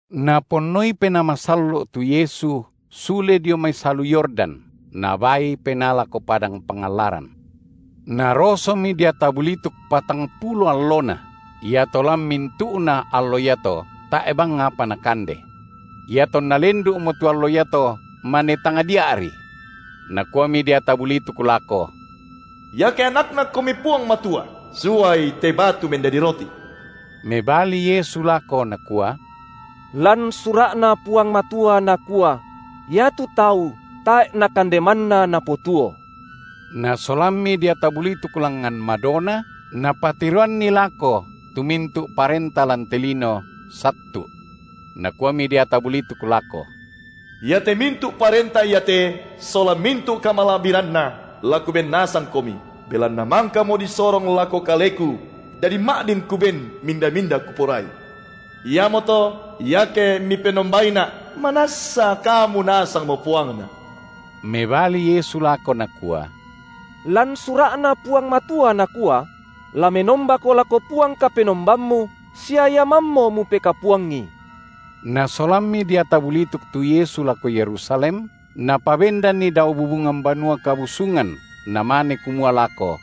Naponnoi Penaa Masallo’ tu Yesu sule dio mai salu Yordan, Nabaal Penaa lako padang pangallaran. Narosomi deata bulituk patangpulo allona. Iato lan mintu’na allo iato tae’ bang apa Nakande. Iatonna lendu’mo tu allo iato mane tangdia’ri. Nakuami deata bulituk lako: Iake AnakNaKomi Puang Matua, suai te batu mendadi roti. Mebali Yesu lako Nakua: Lan Sura’Na Puang Matua nakua: Iatu tau tae’ na kande manna napotuo. Nasolammi deata bulituk langngan madona, napatiroanni lako tu mintu’ parenta lan te lino, sattu’. Nakuami deata bulituk lako: Iate mintu’ parenta iate sola mintu’ kamala’biranna la kuben nasangKomi, belanna mangkamo disorong lako kaleku, dadi ma’din kuben minda-minda kuporai. Iamoto, iake Mipenombaina’, manassa Kamu nasangmo puangna. Mebali Yesu lako Nakua: Lan Sura’Na Puang Matua nakua: La menombako lako Puang Kapenombammu sia Ia mammo mupekapuangi. Nasolammi deata bulituk tu Yesu lako Yerusalem, napabendanNi dao bubungan Banua Kabusungan, namane kumua lako: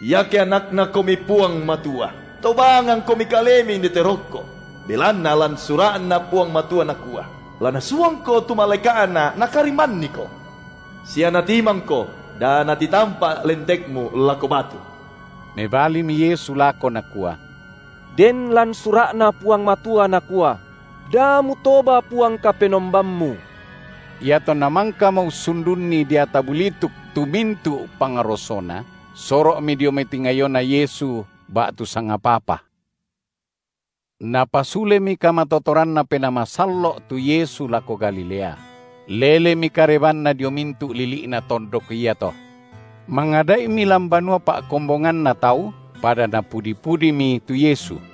Iake AnakNaKomi Puang Matua, tobangangKomi Kalemi indete rokko, belanna lan Sura’Na Puang Matua nakua: La Nasuangko tu malaeka’Na nakarimmanniko; sia natimangko da natitampa’ lentekmu lako batu. Mebalimi Yesu lako Nakua: Den lan Sura’Na Puang Matua nakua: Da mutoba Puang Kapenombammu. Iatonna mangkamo ussundunni deata bulituk tu mintu’ pangrosona, soro’mi dio mai tingayoNa Yesu ba’tu sangapa-apa. Napasulemi kamatotoranNa Penaa Masallo’ tu Yesu lako Galilea; lelemi karebanNa dio mintu’ lili’na tondok iato. Mangada’imi lan banua pa’kombonganna tau, pada napudi-pudimi tu Yesu.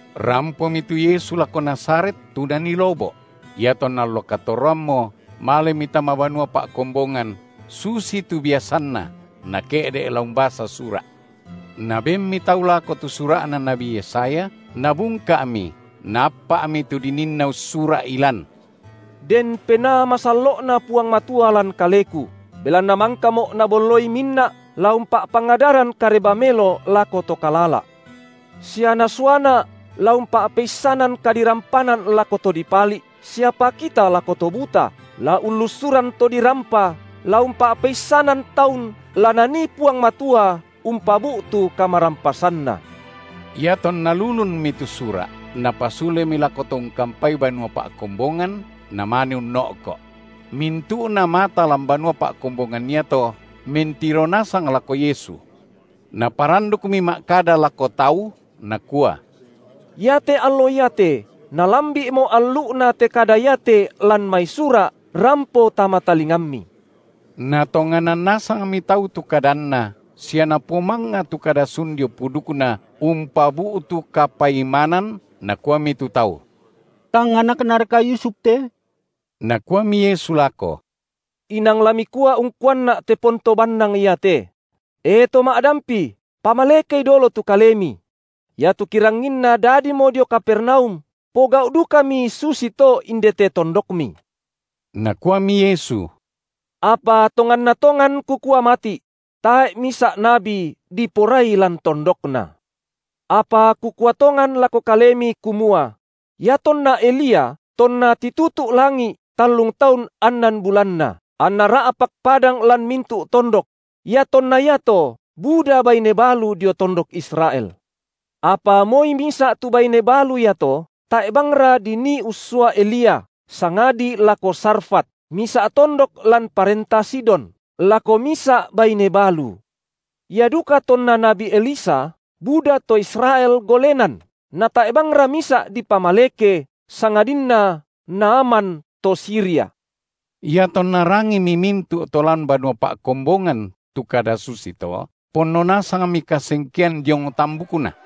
Rampomi tu Yesu lako Nazaret, tu Nanii lobo’; iatonna allo katorroammo malemi tama banua pa’kombongan, susitu biasanNa, Nake’de’ la umbasa sura’. Nabenmi tau lako tu sura’na nabi Yesaya, Nabungka’mi, Naappa’mi tu dininna ussura’i lan: Den Penaa Masallo’Na Puang Matua lan Kaleku, Belanna mangkaMo’ Nabolloi minna’ la umpa’pangadaran Kareba melo lako to kalala’; sia NasuaNa’, la umpa’peissanan kadirampanan lako to dipali’, sia pakita lako to buta, la ullussuran to dirampa, la umpa’peissanan taun la Nanii Puang Matua umpabu’tu kamarampasanNa. Iatonna lulunmi tu sura’, Napasulemi lako to ungkampai banua pa’kombongan, Namane unno’ko’; mintu’na mata lan banua pa’kombongan iato mentiro nasang lako Yesu. Naparandukmi ma’kada lako tau, Nakua: Iate allo iate malambi’mo allu’na te kada iate lan mai Sura’ rampo tama talingammi. Natonganan nasangmi tau tu kadanNa sia napomangnga tu kada sun dio pudukNa umpabu’tu kapaimanan, nakuami tu tau: tang anaknaraka Yusuf te? Nakuami Yesu lako: Inang la mikua ungkuanNa’ te ponto bannang iate: E! to ma’dampi, pamalekei dolo tu Kalemi; iatu kiranginna dadimo dio Kapernaum, pogau’ dukami susito indete tondokMi. Nakuami Yesu: Apa tonganna tongan Kukua mati’: Tae’ misa’ nabi diporai lan tondokna. Apa Kukua tongan lako kalemi, kumua: Iatonna Elia, tonna titutu’ langi’ tallung taun annan bulanna, anna ra’pak padang lan mintu’ tondok; iatonna iato buda baine balu dio tondok Israel. Apa moi misa’ tu baine balu iato tae’ bangra dinii ussua Elia, sangadi lako Sarfat, misa’ tondok lan parenta Sidon, lako misa’ baine balu. Ia duka tonna nabi Elisa buda to Israel golenan natae’ bangra misa’ dipamaleke sangadinna Naaman to Siria. Iatonna rangimi mintu’ to lan banua pa’kombongan tu kada susito, ponno nasangmi kasengkean diong tambukna.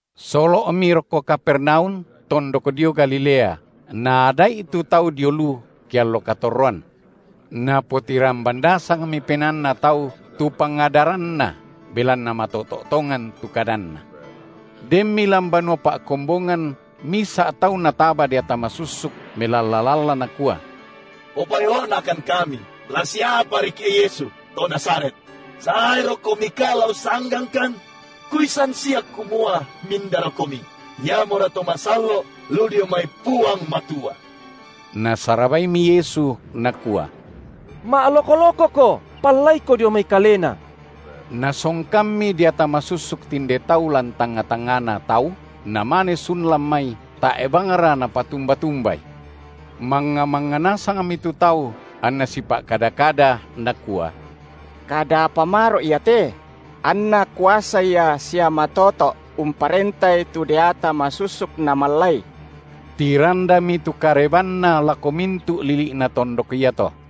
Solo’mi rokko Kapernaum, tondok dio Galilea, naada’i tu tau dio lu, ke allo katorroan. Napotiramban nasangmi penaanna tau tu pangadaranNa, belanna matoto’ tongan tu kadanNa. Denmi lan banua pa’kombongan misa’ tau nataba deata masussuk, melalla-lalla nakua: Popa’elo’nakan kami, la siapariki’ e Yesu, to Nazaret! SaeroKomika la ussanggangkan? Kuissan sia kumua mindaraKomi, iamora To masallo’ lu dio mai Puang Matua. Nasarabaimi Yesu, Nakua: ma’loko-lokoko, pallaiko dio mai kalena. Nasongkammi deata masussuk tinde tau lan tangnga-tangngana tau, namane sun lan mai, tae’ bangra napatumba-tumbai. Mangnga-mangnga nasangmi tu tau, anna sipa’kada-kada, nakua: Kada apa maro’ ia te? Anna kuasa Ia sia matoto’ umparentai tu deata masussuk namallai! Tirandami tu karebanNa lako mintu’ lili’na tondok iato.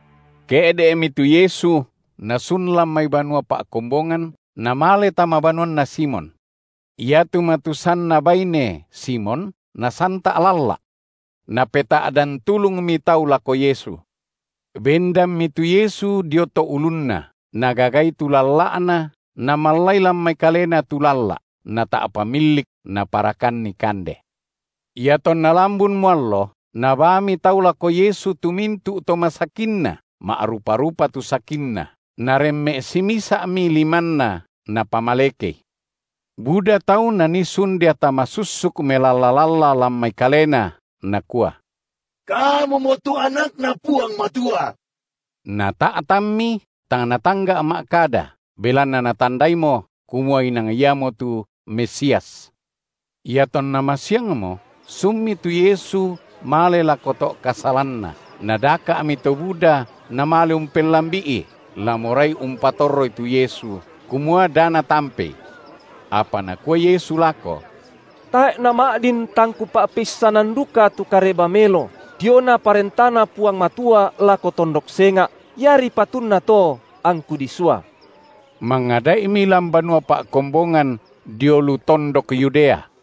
Ke’de’mi tu Yesu Nasun lan mai banua pa’kombongan, Namale tama banuanna Simon. Iatu matusanna baine Simon nasanta’ lalla’. Napeta’dan tulungmi tau lako Yesu. Bendanmi tu Yesu dio to’ ulunna, Nagagai tu lalla’na namallai lan mai kalena tu lalla’ nata’pa millik, naparakanni kande. Iatonna lambunmo allo, nabaami tau lako Yesu tu mintu’ to masakinna, ma’rupa-rupa tu sakinna, Naremme’ simisa’mi limanNa, Napamalekei. Buda tau nanii sun deata masussuk melalla-lalla lan mai kalena, nakua: Kamumo tu AnakNa Puang Matua. Nata’tanmi, tang Natangga’ ma’kada, belanna natandaimo, kumua inang iamotu Mesias. Iatonna masiangmo, sunmi tu Yesu male lako to’ kasalanna, nadaka’mi to buda namale umpellambi’i, la morai umpatorroI tu Yesu, kumua da Natampei. Apa nakua Yesu lako: Tae’ nama’din tang Kupa’peissanan duka tu Kareba melo, diona ParentaNa Puang Matua lako tondok senga’, iari patunna to angKu disua. Mangada’imi lan banua pa’kombongan dio lu tondok Yudea.